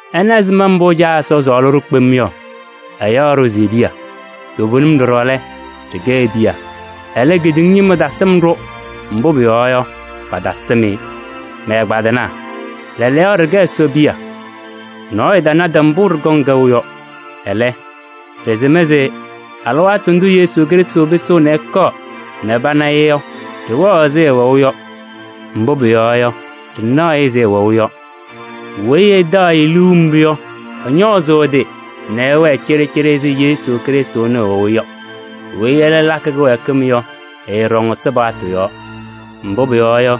Ɩna ɛzɩma mbʋ Caa Ɛsɔ sɔɔlɩ-ɖʋ kpem yɔ: ɛyaɣ-ɖʋ se e-piya. Toovenim ɖɔɖɔ lɛ, ɖɩkɛ e-piya. Ɛlɛ, kedeŋa ñɩma tasɩm-ɖʋ, mbʋ pʋyɔɔ yɔ, patasɩm-ɩ. Mɛ-ɛgbaadɩnaa! Lɛɛlɛɛyɔ ɖɩkɛ Ɛsɔ piya. Nɔɔyʋ tanadɩ mbʋ ɖɩkɔŋ kɛʋ yɔ. Ɛlɛ, ɖɩsɩm se alɩwaatʋ ndʋ Yesu Krɩstʋ pɩsɩɣ ɛkɔɔ nɛ pana-ɩ yɔ, ɖɩwɛɣ ɛzɩ ɛwɛʋ yɔ, mbʋ pʋyɔɔ yɔ, ɖɩnaɣ-ɩ ɛzɩ ɛwɛʋ yɔ. Weyi ɛtaɣ-ɩ liu mbʋ yɔ, ɛñɔɔzʋʋ ɛ-tɩ nɛ ɛwɛɛ cɩɖɩcɩɖɩ ɛzɩ Yesu Krɩstʋ ɛnʋ ɛwɛʋ yɔ. Weyi ɛlɛ lakɩ kɩwɛɛkɩm yɔ, ɛɛɖɔŋ Ɛsɔ paɣtʋ yɔɔ. Mbʋ pʋyɔɔ yɔ,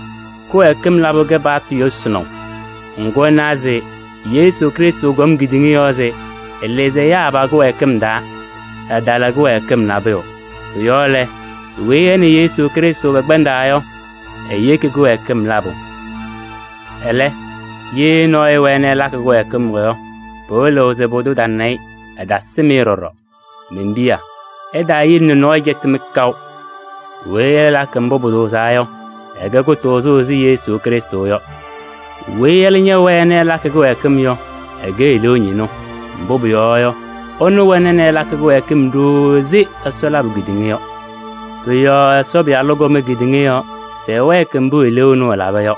kɩwɛɛkɩm labʋ kɛ paɣtʋ yʋsɩnaʋ. Ŋgʋ ɩnawa se Yesu Krɩstʋ kɔm kedeŋa yɔɔ se ɛlɩzɩ ɛyaa pa-kɩwɛɛkɩm taa, ɛtala kɩwɛɛkɩm nabʋyʋ. Pʋ-yɔɔ lɛ, weyi ɛ nɛ Yesu Krɩstʋ pɛkpɛndaa yɔ, eyeki kɩwɛɛkɩm labʋ. Ɛlɛ, ye nɔɔyʋ ɛwɛɛ nɛ ɛlakɩ kɩwɛɛkɩm yɔ, pɩwɩlɩɣ se pʋdʋ tana-ɩ, ɛtasɩm-ɩ ɖɔɖɔ. Men-piya! Ɩtaayele nɛ nɔɔyʋ cɛtɩ-mɩ kaʋ! Weyi ɛlakɩ mbʋ pʋtʋʋzaa yɔ, ɛkɛ kʋtʋʋzʋ ɛzɩ Yesu Krɩstʋ yɔ. Weyi ɛlɛ ñɛwɛɛ nɛ ɛlakɩ kɩwɛɛkɩm yɔ, ɛkɛ eleeu ñɩnʋ. Mbʋ pʋyɔɔ yɔ, ɛnʋ wɛna nɛ ɛlakɩ kɩwɛɛkɩm ɖooo ɛzɩ Ɛsɔ labʋ kedeŋa yɔ. Pʋ-yɔɔ Ɛsɔ Pɩyalʋ kɔm kedeŋa yɔɔ se ɛwɛɛkɩ mbʋ eleeu ɛnʋ ɛlaba yɔ.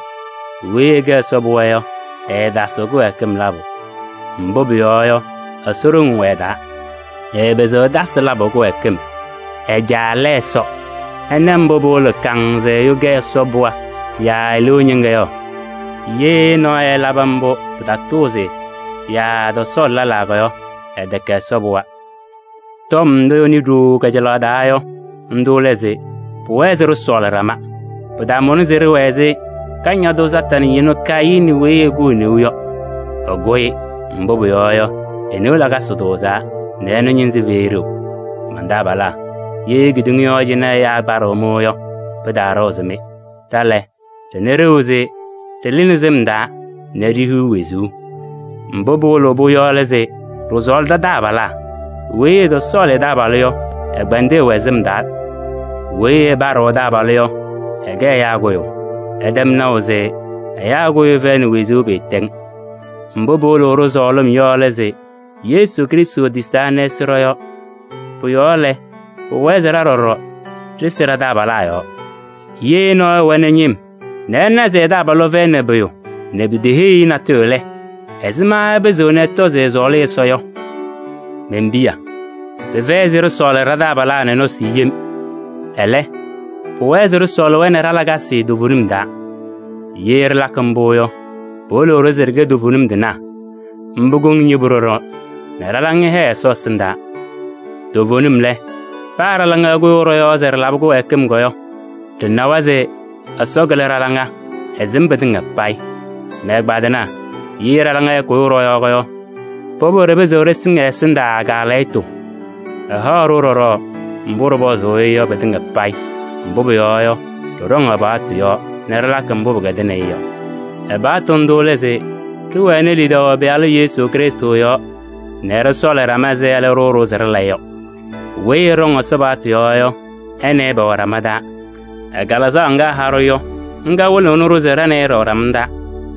Weyi ɛkɛ Ɛsɔ pɩɣa yɔ, ɛɛtasɩɣ kɩwɛɛkɩm labʋ. Mbʋ pʋyɔɔ yɔ, Ɛsɔ ɖoŋ wɛ ɛ-taa. Ɛɛpɩzɩɣ ɛtasɩ labʋ kɩwɛɛkɩm: ɛ-Caa lɛ Ɛsɔ. Ɩna mbʋ pɩwɩlɩɣ kaŋŋ se ɛyʋ kɛ Ɛsɔ pɩɣa yaa eleeu ñɩŋga yɔ: ye nɔɔyʋ ɛlabɩ mbʋ pɩtatʋʋzɩ yɔ yaa ɛtɔsɔɔlɩ lɛlaa yɔ, ɛtɛkɛ Ɛsɔ pɩɣa. Tɔm ndʋ ɩnɩ ɖooo kajalaɣ taa yɔ, ndʋ lɛ se: pʋwɛɛ se ɖɩsɔɔlɩ ɖama. Pɩtamʋnɩ se ɖɩwɛɛ ɛzɩ Kañadʋ Satanɩ ñɩnʋ Kayɩnɩ weyi ɛkʋ e-neu yɔ. Ɛkʋ-ɩ, mbʋ pʋyɔɔ yɔ, e-neu lakasɩ tʋʋzaa nɛ ɛnʋ ñɩnzɩ fɛyɩ ɖeu. Man-taabalaa! Ye kedeŋa yɔɔ cɩnɛ ɛyaa ɛpaɖɩɣ-mɩ yɔ, pɩtaaɖɩɣzɩ-mɩ. Ɖa lɛ, ɖɩna ɖeu se ɖɩlɩ sɩm taa nɛ ɖihiɣ wezuu, mbʋ pɩwɩlɩɣ-pʋ yɔ lɛ se ɖɩsɔɔlɩ ɖa-taabalaa. Weyi ɛtɔsɔɔlɩ ɛ-taabalʋ yɔ, ɛkpɛndɩ ɛwɛ sɩm taa. Weyi ɛpaɖɩɣ ɛ-taabalʋ yɔ, ɛkɛ ɛyaa kʋyʋ. Ɩtɛm naʋ se ɛyaa kʋyʋ fɛyɩnɩ wezuu pɩɩtɛŋ. Mbʋ pɩwɩlɩɣ-ɖʋ sɔɔlɩm yɔ lɛ se: Yesu Krɩstʋ tisaa nɛ ɛsɩ ɖɔ-yɔɔ. Pʋ-yɔɔ lɛ, pʋwɛɛ se ɖa ɖɔɖɔ ɖɩsɩ ɖa-taabalaa yɔɔ. Ye nɔɔyʋ ɛwɛnɩ ñɩm nɛ ɛna se ɛ-taabalʋ fɛyɩnɩ pʋyʋ nɛ piteheyi-i natʋyʋ lɛ, ɛzɩma ɛpɩzɩɣ ɛtɔ se ɛsɔɔlɩ Ɛsɔ yɔ? Men-piya! Pɩfɛyɩ se ɖɩsɔɔlɩ ɖa-taabalaa nɛ nɔsɩ yem, ɛlɛ, pʋwɛɛ se ɖɩsɔɔlɩ-wɛ nɛ ɖa-lakasɩ toovenim taa. Ye ɖɩlakɩ mbʋ yɔ, pɩwɩlɩɣ-ɖʋ se ɖɩkɛ toovenim tɩnaa. Mbʋ kɔŋnɩ yebu ɖɔɖɔ nɛ ɖa-laŋa hɛɛ Ɛsɔ ɛsɩndaa. Toovenim lɛ, paa ɖa-laŋa ɛkʋyʋʋ ɖɔ-yɔɔ se ɖɩlabɩ kɩwɛɛkɩm yɔ, ɖɩnawa se Ɛsɔ kɩlɩ ɖa-laŋa, ɛsɩm pɩtɩŋa payɩ. Mɛ-ɛgbaadɩnaa! Ye ɖa-laŋa ɛɛkʋyʋʋ ɖɔ-yɔɔ yɔ, pʋbʋ ɖɩpɩzɩɣ ɖɩsɩŋ ɛ-ɛsɩndaa kaalɛyɩtʋ. Ɛhaɣ-ɖʋ ɖɔɖɔ mbʋ ɖɩpɔzʋʋ-ɩ yɔ pɩtɩŋa payɩ, mbʋ pʋyɔɔ yɔ, ɖɩɖɔŋ ɛ-paɣtʋ yɔɔ nɛ ɖɩlakɩ mbʋ pɩkɛdɩnɩ-ɩ yɔ. Ɛ-paɣtʋ ndʋ lɛ se: ɖɩwɛnɩ lidaʋ ɛ-Pɩyalʋ Yesu Krɩstʋ yɔɔ nɛ ɖɩsɔɔlɩ ɖama ɛzɩ ɛlɛ ɖʋʋ-ɖʋ se ɖɩla yɔ. Weyi ɛɖɔŋ Ɛsɔ paɣtʋ yɔɔ yɔ, ɛ nɛ ɩ pɛwɛ ɖama taa. Ɛ-Kalɩzaɣ ŋga ɛha-ɖʋ yɔ, ŋga wɩlɩɣnɩ-ɖʋ se ɖa nɛ ɩ ɖɩwɛ ɖama taa.